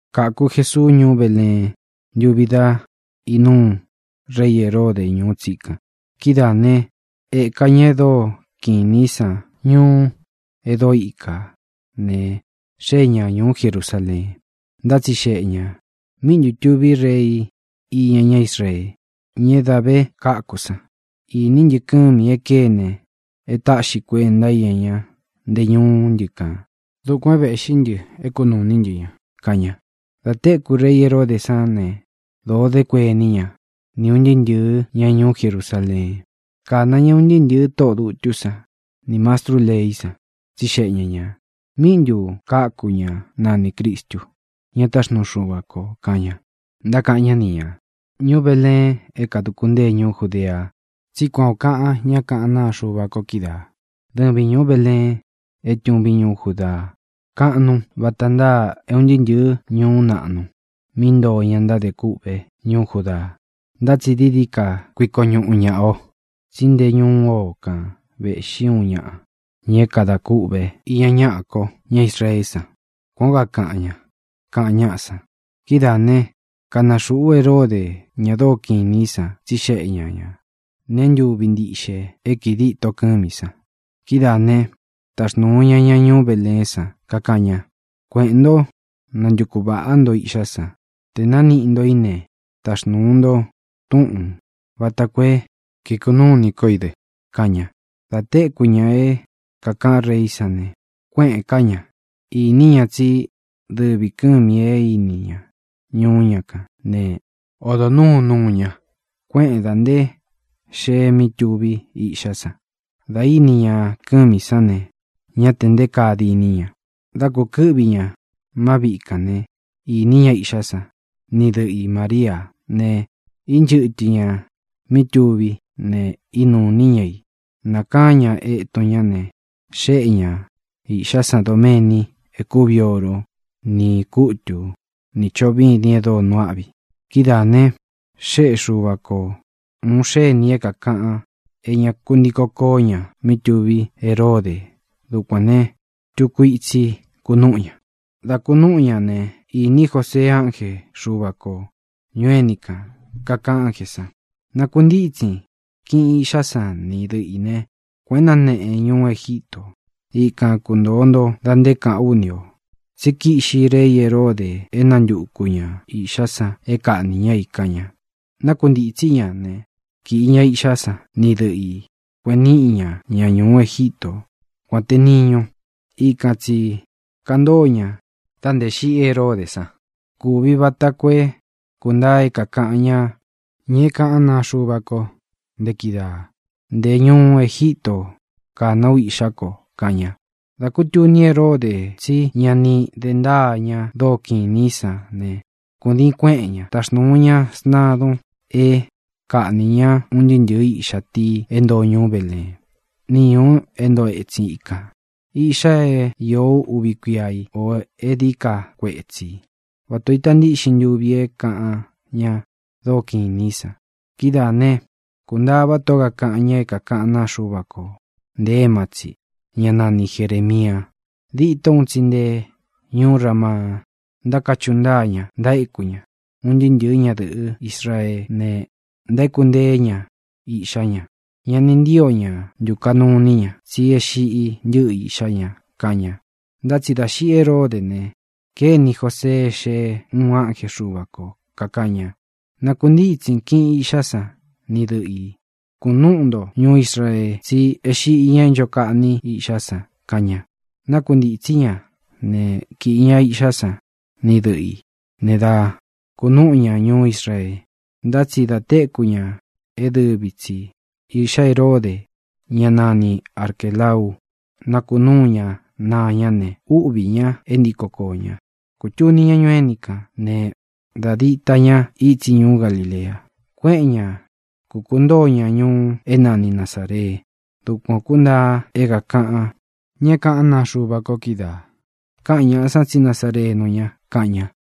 Kāku Jesuu ñuú Beleen ntuvi dá inúu rei Heróde ñūú tsikan. Kidáā né, ēka ña e dóo kiꞌin inī í san ñuú e dóo ikā ne, xée ña ñūú Jerusaleen. Ntátsixeꞌe ñā: —¿Míꞌi ntu tūví rei iña ñá Israee, ña é dā ve káku san? Īní ntɨ kɨ́mī e kéne e táꞌxi kuenta íña ñá nte ñúú ntɨ kān. Dukuān é vēꞌxí ntɨ é kunūu iní ntɨ ña —kaꞌan ña. Dā téku rei Heródē sán ne, dōo dé kuení ña, ni ūn ntɨɨ́ ntɨ̄ɨ́ ña ñuú Jerusaleen. Kāna ña un ntɨɨ́ ntɨ̄ɨ tóꞌō dutú san nī mastrú leí san, tsixeꞌe ña ñā: —¿Míꞌi ntu kāku ñá nanī Cristu, ña táxnuu Xuva kō? —kaꞌan ña. Ntákaꞌan ñá ni ñā: —Ñuú Beleen é kāduku ntée ñuú Judea, tsí kuan ō kaꞌan ñá kaꞌán naa Xuva ko kídaā: Dɨvin, ñūú Beleen é tūvín ñuú Judaa, kaꞌnun vata ntáa é un ntɨɨ́ ntɨ̄ɨ́ ñuú naꞌnu mí ntoo ña ntádē kûꞌvé ñuú Judaa. Ntá tsi dií dií ka kuiko ñuꞌu ñāꞌa o, tsí nte ñúu o kan vēꞌxí uun ñaꞌa, ña kada kûꞌvé iña ñaꞌa ko, ñá Israeé san. Kuan ō kaꞌan ña —kaꞌan ñáꞌa san. Kidáā né, kāna xuꞌu Heródē ña dóo kiꞌin inī í san, tsixeꞌe ña ñā nee ntúvi ntiꞌxe é kii díto kɨ́mī san. Kidáā né, taxnūu ña ña ñuú Beleén san, kakaꞌan ña: —Kueꞌēn ntó, nantuku vāꞌá nto iꞌxá san. Te nāniꞌi nto í ne, taxnūu nto túꞌūn vata koo é kikunúu ini kó i dɨ —kaꞌan ña. Dā téku ña é kākaꞌán reí san ne, kuéꞌēn ká ña. Īní ña tsí dɨvī kɨ́mī e íni ña ñuú ña kān né, odo nūú nuu ña, kuéꞌēn da nté xee mí tuví iꞌxá san. Dā íni ña kɨ́mī sán ne, ñá tē nté kaa diní ña. Dá kūkɨ́ꞌvi ña má viꞌi kān né, īní ña iꞌxá san ni dɨꞌɨ i Māríā ne, ínchɨtɨ ñā mí tuví ne, ínūu iní ña i. Nākaán ña etun ñá ne, xéꞌe ña īꞌxá san doméni e kúvi oro, ni kūtú, nī choꞌo vîdin e dóo nuu áꞌvi. Kidáā ne, xéꞌe Xuva ko ūun xénī é kākaꞌan é ña ku ntiko koó ña mí tuví Heródē. Dukuān ne, tuku itsi kunúꞌu ña. Dā kunúꞌu ña ne, īní Josee ánje Xuva kō ñuu éni kān. Kaꞌan ánjē san: —Nakuntítsin, kiꞌin īꞌxá san ni dɨꞌɨ ī né, kueꞌen náneꞌen ñuú Egítō. Ikan kuntōo nto da nté kāꞌán u ni ō. Tsí kiꞌxi rei Heródē é nantuku ña īꞌxá san é kaꞌnī ñá i —kaꞌan ña. Nákuntītsí ña ne, kīꞌi ña iꞌxá san ni dɨꞌɨ ī, kueꞌen níꞌi ña ña ñūú Egíto, kuān te niñu. Ikān tsi kantóo ña dā nté xiꞌi Heródē san. Sáꞌā kúvi vata koo é kūntaa é kākaꞌan ñáꞌa, ña é kaꞌán naa Xuva ko nte kídaā: “Nté ñūu Egítō nákaná u iꞌxá ko”, kaꞌan ña. Dā kútuni Heródē tsí ña ni de ntáa ña dóo kiꞌin inī í san ne, kūdiin kuéꞌen ña. Taxnūu ña sntadun é kaꞌnī ñá un ntɨɨ́ ntɨ̄ɨ́ iꞌxa tii é ntoo ñuú Beleén, ni ñūu é ntoo etsin ikān, iꞌxa é īó uvi kuia í, ō é dií ka kuetsī, vata ō ita ntíꞌxin ntuvi é kaꞌan ña dóo kiꞌin inī í san. Kidáā né, kūntaá vata ō kaꞌan ña é kaꞌán naa Xuva ko nte éma tsi, ñá nani Jerēmia: Dîtó un tsi nte ñuú Ramaa ntákachuꞌu ntáa ña, ntaéku ña. Un ntɨɨ́ ntɨ̄ɨ́ ñadɨ̄ꞌɨ́ Israeé ne, ntaéku nteé ña iꞌxá ña. Ña ni ntío ña ntukaꞌnu iní ña, tsí é xiꞌi ntɨ́ꞌɨ iꞌxá ña, kaꞌan ña. Ntá tsi dā xiꞌi Heródē ne, kéni Josee é xee uun ánje Xuva kō, kakaꞌan ña: —Nakuntítsin, kiꞌin īꞌxá san ni dɨꞌɨ ī, kunúꞌu nto ñuú Israee, tsí e xíꞌi ña é ncho kaꞌní iꞌxá san —kaꞌan ña. Nákuntītsí ña ne, kīꞌi ña iꞌxá san ni dɨꞌɨ ī ne, dá kunúꞌu ña ñuú Israee. Ntá tsi dā téku ña é dɨvi tsi īꞌxá Heródē, ñá nani Arquēlau, nakunúu ña naa ñá ne, úꞌvī ña é ntiko koō ña. Kūtuni ña ñuu éni kān ne, da díta ña itsi ñuú Galilea. Kuéꞌen ña, kūkuntóo ña ñuu é nani Nazāree. Dukuan ō kúntaa é kākaꞌan ña é kaꞌán naa Xuva ko kídaā: “Kaꞌan ñáꞌa san tsí nazarenu ña”, kaꞌan ña.